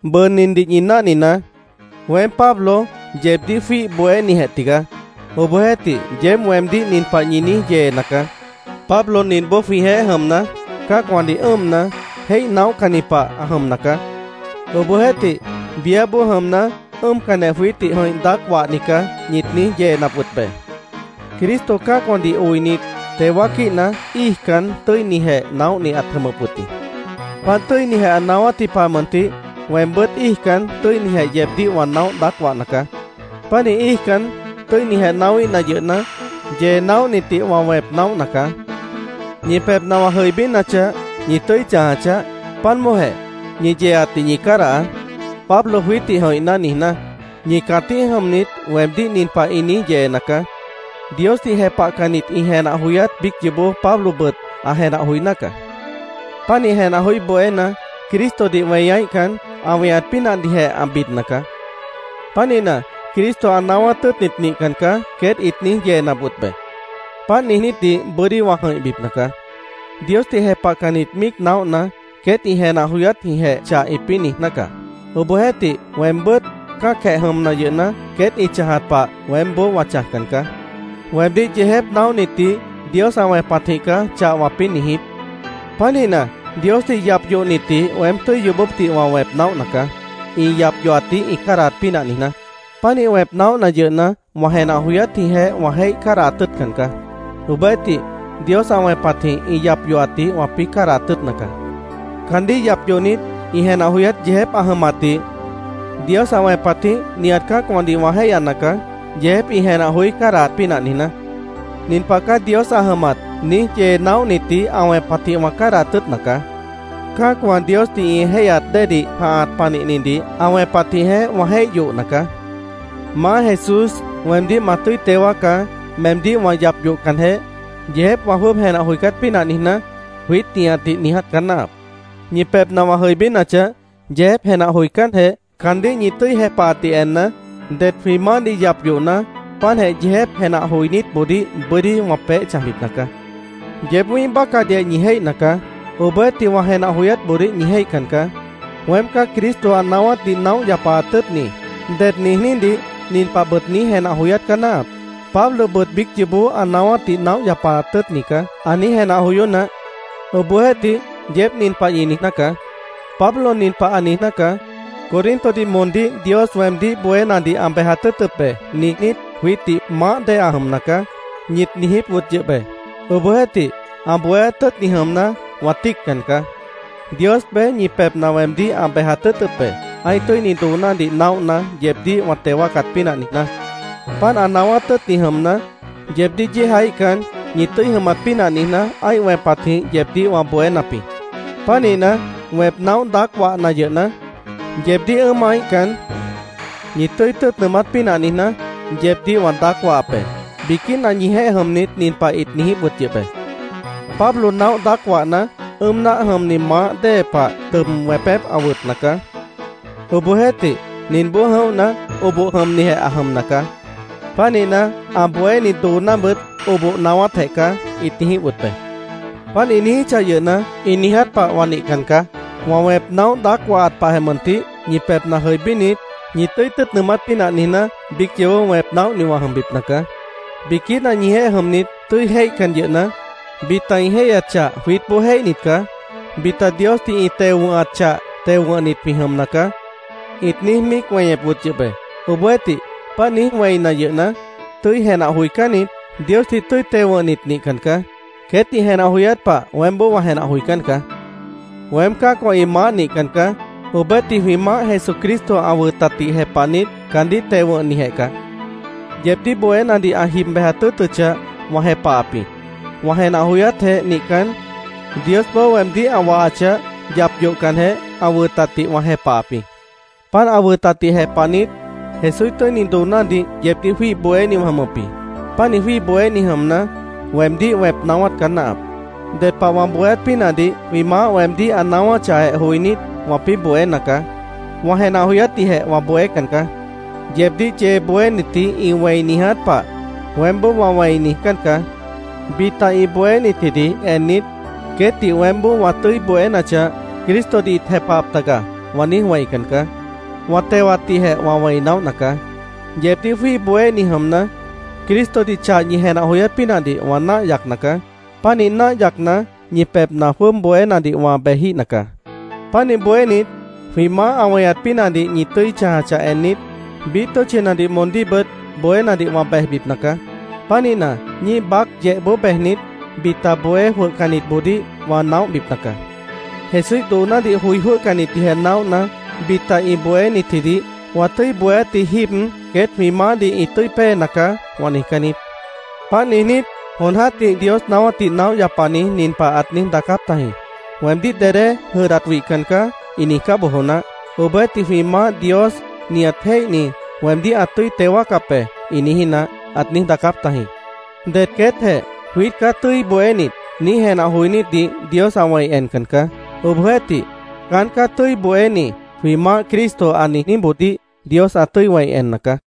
Bʉʉ nindih ñi náhninaá. Weém, Pablo, yeebdíh jwíih bohénijeh tigaá. Obohjeéhtih, yeéb weemdíh nin pah ñi niíj yeena caá: “Pablo ninboó jwĩjeéh jʉmna, cã́acwãdih ʉ́ʉmna, jéih naóhcanni pah ã jʉmna caá. Obohjeéhtih, biáboó jʉmna, ʉ́ʉmcanjeh jwiítdih jʉ̃ih naóh daác wahni caá”, ñit niíj yeenap wʉt be. Cristo cã́acwãdih oinit, teo wáaquíhna, íijcan tʉ́inijeh naóhni ãt jʉmʉp wʉt jĩ. Páant tʉ́inijeh ã naáwátji pah mʉntih weembʉ́t íijcan tʉ́inijeh yeebdíh wã naóh daác wahna caá. Pánih íijcan tʉ́inijeh naáwíhna yʉhna, yee naóhnitdih wã wẽp naóhna caá. Ñi pebhna wã jʉibínachah, ñi tʉ́i chãja chaáh, páant bóojeh, ñi yeeatdih ñi cádahaá, “Pablo jwiítdih jʉ̃ihná”, niijná. Ñi cãtíh jʉmnit, weemdíh nin pah ĩ niíj yeena caá: “Diosdih jepahcannit ĩ jenah joyát biíc yoobó Pablobʉt ã jenah joiná caá. Pánih jenah joí bohéna, Cristodih weñaíhcan, ã weñat pínahdihjeh ã bidna caá. Pánihna, Cristo ã naáwát tʉ́ʉtni nihcan caá”, queét ĩt niíj yeenap wʉt be. Páant niijnítdih bʉ́dí wã jʉ̃ihbipna caá. Diosdih jepahcannit míic naóhna, queét ĩ jenah joyátjĩhjeh chah ĩpĩ́ niijná caá. Obohjeéhtih, weembʉ́t cã́acjeh jʉmna yʉhna, queét ĩ chãjat pah weémboó wã chãjcan caá. Weemdíh yeejép naóhnitdih Dios ã wẽpatjĩh caá chah wãpĩ́ niijíp. Pánihna, Diosdih yap yohnitdih weém tʉ́i yoobópdih wã wẽp naóhna caá, ĩ yap yohatdih ĩ cádahat pínah niijná. Pánih wẽp naóhna yʉhna, wã jenah joyátjĩhjeh wã jéih cádahat tʉ́ʉtcan caá. Obohjeéhtih, Dios ã wẽpatjĩh ĩ yap yohatdih wãpĩ́ cádahat tʉ́ʉtna caá. Caandíh yap yohnit, ĩ jenah joyát yeejép ã jʉmatdih Dios ã wẽpatjĩh nihat cã́acwãdih wã jéihyana caá, yeejép ĩ jenah joí cádahat pínah niijná. “Nin pah caá Dios ã jʉmat”, niíj yee naóhnitdih ã wẽpatjĩh wã cádahat tʉ́ʉtna caá. Cã́acwã Diosdih ĩ jéihyat déedih jãhat panihnidih ã wẽpatjĩhjeh wã jéih yohna caá. “Maá Jesús, weemdíh ma tʉ́i teo wáacá, meemdíh yap yohcanjeh, yeejép wã jwʉ́ʉb jenah joicát pínah niijná”, jwiít nihatdih niiját caá náahap. Ñi pebhna wã jʉibínachah, yeejép jenah joicánjeh, caandíh ñi tʉ́i jepahatdih enna, det jwĩ Maáhdih yap yohna, páantjeh yeejép jenah joinítboodíh bʉ́dí wã peéh chãjbipna caá. Yeéb wĩ́ih bácahdihjeh ñi jéihna caá. Obohjeéhtih, wã jenah joyátboodíh ñi jéihcan caá. “Weem caá Cristo ã naáwátdih naóh yapaat tʉ́ʉtni”, ded niijnídih nin pahbʉt niíj jenah joyát caá náahap: “Pablobʉt biíc yoobó ã naáwátdih naóh yapaat tʉ́ʉtni caá”, ã niíj jenah joyó naáh. Obohjeéhtih, yeéb nin pah ñi niijná caá: “Pablo nin pah ã niijná caá: ‘Corintodih moondíh Dios weemdíh bohénadih ã bejat tʉ́ʉtʉp be’, niijnít, jwiítdih maáh dée ã jʉmna caá”, ñit niijíp wʉt yʉh be. Obohjeéhtih, ã bohéát tʉ́ʉtni jʉmna, wã tíiccan caá. Dios beé ñi pebhna weemdíh ã bejat tʉ́ʉtʉp be, ã́ih tʉ́ini doonádih naóhna, yeebdíh wã teo wáacat pínah niijná. Páant ã naáwát tʉ́ʉtni jʉmna, yeebdíh yéejaíhcan, ñi tʉ́i jʉmat pínah niijná, ã́ih wẽpatjĩh yeebdíh wã bohénap jĩ. Pánihna, wẽp naóh daác wahna yʉhna, yeebdíh ʉ́ʉmaíhcan, ñi tʉ́i tʉ́ʉt nʉʉmát pínah niijná, yeebdíh wã daác wahap be. Biquína ñijeéh jʉmnit nin pah ĩt niijíp wʉt yʉh be: “Pablo naóh daác wahna, ʉ́ʉm náah jʉmni maáh dée pah tʉb wẽpép ã wʉtna caá. Obohjeéhtih, ninboó jʉ̃óhna, oboh jʉmnijeh ã jʉmna caá. Pánihna, ã bohéni doonábʉt oboh naáwátjeh caá”, ĩt niijíp wʉt be. Páant ĩ niijíchah yʉhna, ĩ niiját pah wã nihcan caá. Wã wẽp naóh daác wahat pahjeh mʉntih, ñi pebhna jʉibínit, ñi tʉ́i tʉ́ʉt nʉʉmát pínah niijná, biíc yoobó wẽp naóhni wã jʉmbipna caá. Biquína ñijeéh jʉmnit, tʉ́i jéihcan yʉhna, “Bita ĩ jéihyat chah jwiítboó jéihnit caá. Bita Diosdih ĩ teo wʉ̃hat chah teo wʉ̃hnit jwĩ jʉmna caá”, ĩt niíj míic weñep wʉt yʉh be. Obohjeéhtih, páant niíj wẽina yʉhna, tʉ́i jenah joicánnit, Diosdih tʉ́i teo wʉ̃hnit nihcan caá. Queét ĩ jenah joyát pah weémboó wã jenah joicán caá. Weém cã́acwã ĩ maáh nihcan caá. Obohjeéhtih, jwĩ Maáh Jesucristo ã wʉtatdih jepahnit, caandíh teo wʉ̃hnijeh caá. Yeebdíh bohénadih ã jib bejat tʉ́ʉtʉchah, wã jepahap jĩ. Wã jenah joyátjeh nihcan, Diosboó weemdíh ã wahachah, yap yohcanjeh, ã wʉtatdih wã jepahap jĩ. Páant ã wʉtatdih jepahnit, Jesúíh tʉ́ini doonádih yeebdíh jwíih bohéni wã jʉmʉp jĩ. Pánih jwíih bohéni jʉmna, weemdíh wẽp naáwát caá náahap. Ded pah wã bohéát pínahdih jwĩ Maáh weemdíh ã naáwáchahjeh joinít, wãpĩ́ bohéna caá. Wã jenah joyátdihjeh wã bohécan caá. Yeebdíh yee bohénitji ĩ wẽi niiját pah, weémboó wã wẽi niijcán caá. Bita ĩ bohénitjidih ennit “Queétdih weémboó wã tʉ́i bohénachah, Cristodih ĩt jepahap taga”, wã niíj wẽican caá. Wã tewatdihjeh wã wẽi naóhna caá. Yeebdíh jwíih bohéni jʉmna, Cristodih chah ñi jenah joyát pínahdih wã náah yacna caá. Pánih náah yacna, ñi pebhna jwʉ́ʉb bohénadih wã bejíhna caá. Pánih bohénit, jwĩ Maáh ã weñat pínahdih ñi tʉ́i chãjachah ennit, biíh tʉ́tchinadih moondíhbʉt bohénadih wã bejbipna caá. Pánihna, ñíih baác yehboó bejnit, bita bohé jwʉhcannitboodíh wã naóhbipna caá. Jesúíh doonádih joi jwʉ́hcannitdihjeh naóhna, bita ĩ bohénitjidih “Wã tʉ́i bohéátji jíib queét jwĩ Maáhdih ĩ tʉ́i péena caá”, wã niijcán niít. Páant niijnít, jon jã́tih Dios naáwátdih naóh yapani nin pah ãt niíj daacáp tajĩ: “ ‘Weemdíh dedé jʉdhdat wihcan caá’, ĩ niijcá bojo naáh. Obohjeéhtih, ‘Jwĩ Maáh Dios, nihat jéihni, weemdíh ã tʉ́i teo wáacap be’, ĩ niijí naáh”, ãt niíj daacáp tajĩ. Det queétjeh “Jwiít caá tʉ́i bohénit”, niíj jenah joinítdih Dios ã wẽi encan caá. Obohjeéhtih, “Caán caá tʉ́i bohéni”, jwĩ Maáh Cristo ã niijníboodíh Dios ã tʉ́i wẽi enna caá.